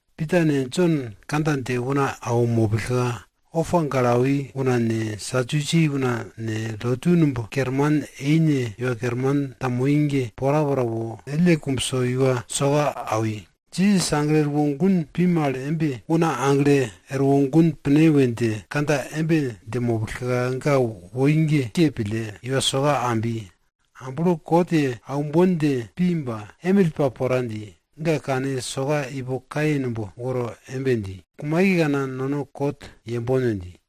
Pita ne Jon kandja dje una awo mopillka, opa gale awi una ne, Sadusi una ne, lotu numb kerman eine iwa kerman ta moi ge, porapora wo, ellne kumbso iwa soka awi. Jisas aglo erwo gun pi mal embe, una aglo erwo gun pine we dje kandja embe dje mopillka, ga woi ge ke pille iwa soka ambi. Amblo kot ye aumbon dje pi ba, emill pa pora dji, ga kane soka ipo kaye numb woro embe dji, kumaikekana nono kot yembon we dji.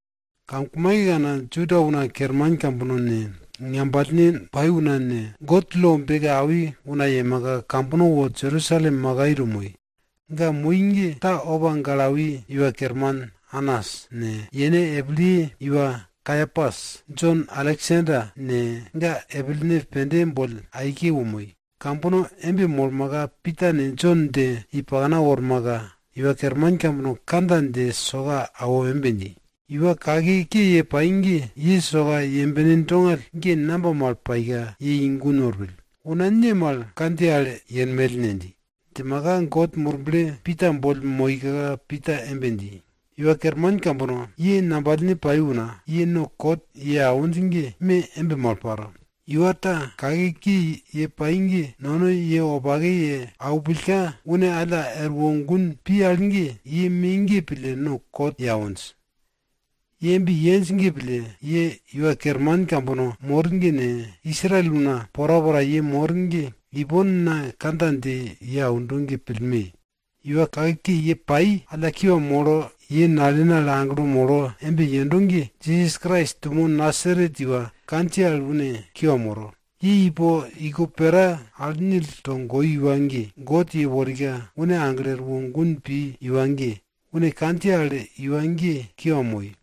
Kamkumaikekana, Juda una kerman kambono ne, ngambalne pai una ne, God lo beke awi una yemaka, kambono wo Jerusalem makai to moi. Ga moi ge ta opa gale awi iwa kerman Anas ne, yene epilye iwa Kaiapas, Jon, Aleksander ne, ga epilene pende boll aike wo moi. Kambono embe molmaka, Pita ne Jon dje i pakna wormaka, iwa kerman kambono kandja dje soka awo embe dji, iwa kake ke ye pai ge ye soka yembene dongall ge namba mal paika ye i gun worpill? Una ne mal kandjiye al yepill ne? dji. Djimaka God Murble Pita boll moika Pita embe dji, iwa kerman kambono ne, ngambalne pai una, ye no kot ye awinj ge me embe mal paro. Iwa ta kake ke ye pai ge no ye wopake ye aupillka une alla erwo gun pi al ge, ye me ge pille no kot ye awinj. Ye embe yenj ge pille, ye iwa kerman kambono mor ne, Israel una porapora ye mor ge ipon na kandja dje ye aundo ge pillme! Iwa kake ke ye pai alla kiwa molo ye nalene al aglo molo embe yendo ge, Jisas Krais dumo Nasaret iwa kandjiye al une kiwa moro. Ye ipo iko pera al nil togoi iwa ge, God yeworika une aglo erwo gun pi iwa ge, une kandjiye al iwa ge kiwa moi.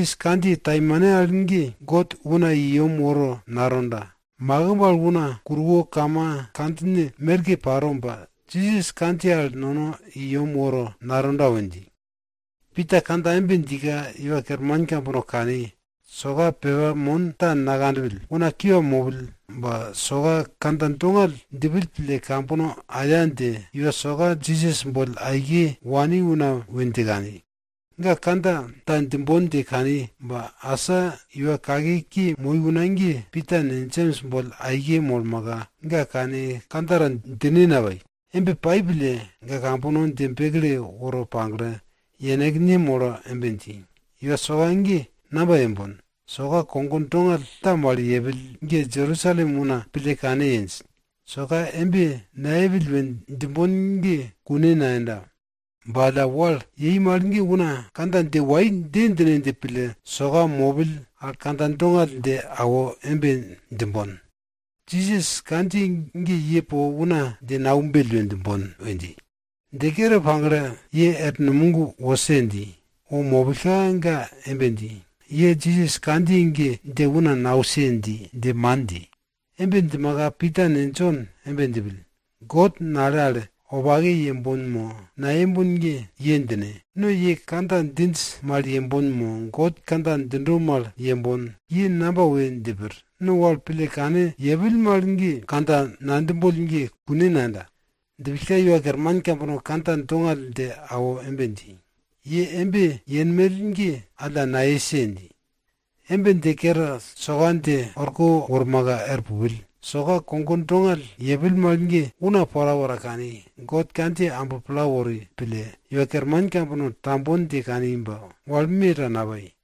Jisas kandjiye taimane al ge God una i yem woro natonda. Makimb al una kuruwo kama kandjine merke paro ba, Jisas kandjiye al nono i yem woro natonda we dji. Pita kandja embe djika, iwa kerman kambono kani, soka pepa mon ta nakanpill, una kiwa mopill, ba soka kandja dongall djipill pille kambono aya dje iwa soka Jisas boll aike wani una we dje kani. Ga kandja ta djimbon dje kani ba, asa iwa kake ke moi una ge Pita ne Jems boll aike molmaka, ga kane kandja ta djine napai. Embe pai pille, ga kambono dje bekle woro pagle yenekne molo embe dji, Iwa soka ge namba yembon? Soka kogo dongall ta mal yepill ge Jerusalem una pille kane yenj. Soka embe nayepill we djimbon ge kune nayenda. Ba alla wal yei mal ge una kandja dje wai dje djine dje pille iwa soka mopell al kandja dongall dje awo embe djimbon, Jisas kandjiye ge ye po una dje naumbell we djimbon we dji. Dje kere pagle, ye er numog wose dji. Wo mopillka, ga embe dji, ye Jisas kandjiye ge dje una nause dje man dji. Embe djimaka, Pita ne Jon embe djipill, God nale al wopake yembon mo nayembon ge, ye djine. No ye kandja djinj mal yembon mo God kandja djindo mal yembon? Ye namba we dje pir? No wal pille kane yepill mal ge kandja nadjimboll ge kune nayenda. Djipillka iwa kerman kambono kandja dongall dje awo embe dji, ye embe yenmell ge alla nayese! dji. Embe dje kere, soka dje orko wormaka er pupill. Soka kogo dongall yepill mal ge una porapora kani, God kandjiye amblo pla wori pille, iwa kerman kambono tambon dje kani ba wal me ta napai.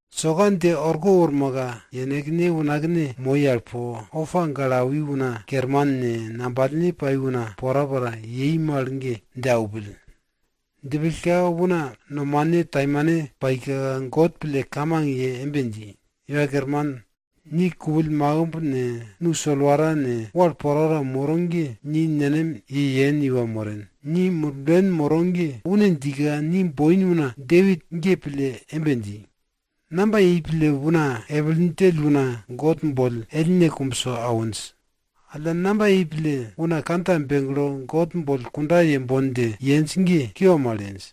Soka dje orko wormaka, yenekne unakne moi al po, opa gale awi una kerman ne, ngambalne pai una porapora yei mal ge, dje aupill. Djipillka una nomane taimane paika God pille kamang ye embe dji, Iwa Kerman, ni kupill makimb ne, nu solwara ne, wal porapora moro ge ni nenem ye yen iwa moren. Ni Murblen moro ge une djika ni boin una Depit ge pille embe dji, Namba yei pille una epil djell una God boll ellne kumbso awinj? Alla namba yei pille una kandja begle God boll kunda yembon dje yenj ge kiwa mal yenj?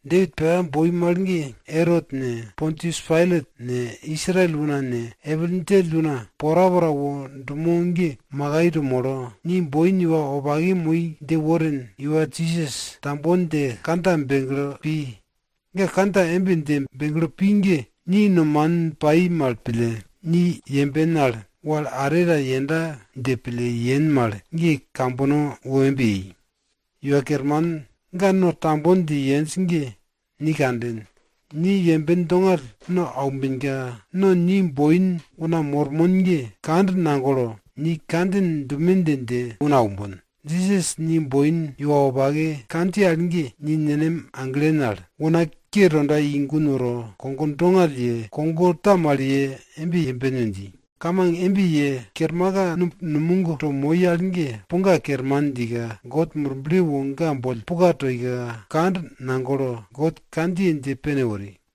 Depit pepa boi mal ge Erot ne, Pontius Pailat ne, Israel una ne, epil djell una porapora wo dumo ge makai to molo, ni boin iwa wopake moi dje worin iwa Jisas tambon dje kandja begle pi. Ga kandja embe dje begle pi ge ni nomanin pai mal pille, ni yemben al wal are ta yenda dje pille yen mal ge kambono wo embe yei. Iwa Kerman, ga no tambon dje yenj ge ni kanden. Ni yemben dongall no aumbenka, no ni boin una mormon ge, kand nagopon, ni kandjin dume dje, dje una aumbon. Jisas ni boin iwa wopake kandjiye al ge, ni nenem aglen al, una ke tonda i gun woro, kogo dongall ye, kogo ta mal ye embe yemben we dji. Kamang embe ye kermaka, numb numog to moi al ge puga kerman djika, God Murble wo ga boll puka toika, kand nagolo God kandjiye dje pene wori.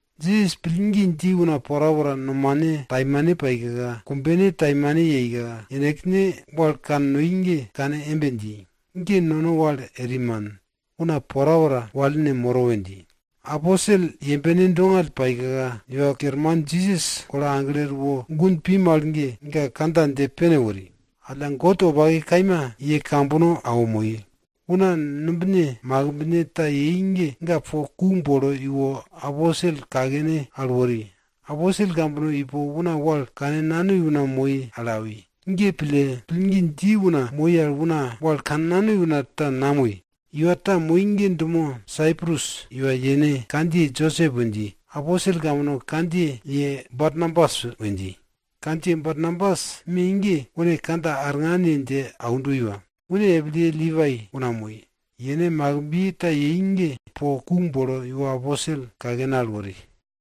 Jisas pillgi dji una porapora nomane taimane paika, kumbene taimane yeika, yenekne wal kannoi ge kane embe dji, ge no wal eri man, una porapora wal moro we dji. Aposel yembene dongall paika, Iwa Kerman Jisas golo aglo erwo gun pi mal ge, ga kandja dje pene wori. Alla, God wopake kaima ye kambono awo moi. Una numbine makimbne ta yei ge ga po ku bolo iwo, aposel kakene al wori. Aposel kambono ipo una wal kannanoi una moi al awi. Ge pille, pillgi dji una moi al una wal kannanoi una ta namoi. Iwa ta moi ge dumo Saiprus iwa yene kandjiye Josep we dji. Aposel kambono kandjiye ye Barnabas we dji. Kandjiye Barnabas me ge une kandja arngan ye dje aundo iwa. Une epilye Lipai una moi. Yene makimbiye ta yei ge po ku bolo iwo aposel kakene al wori.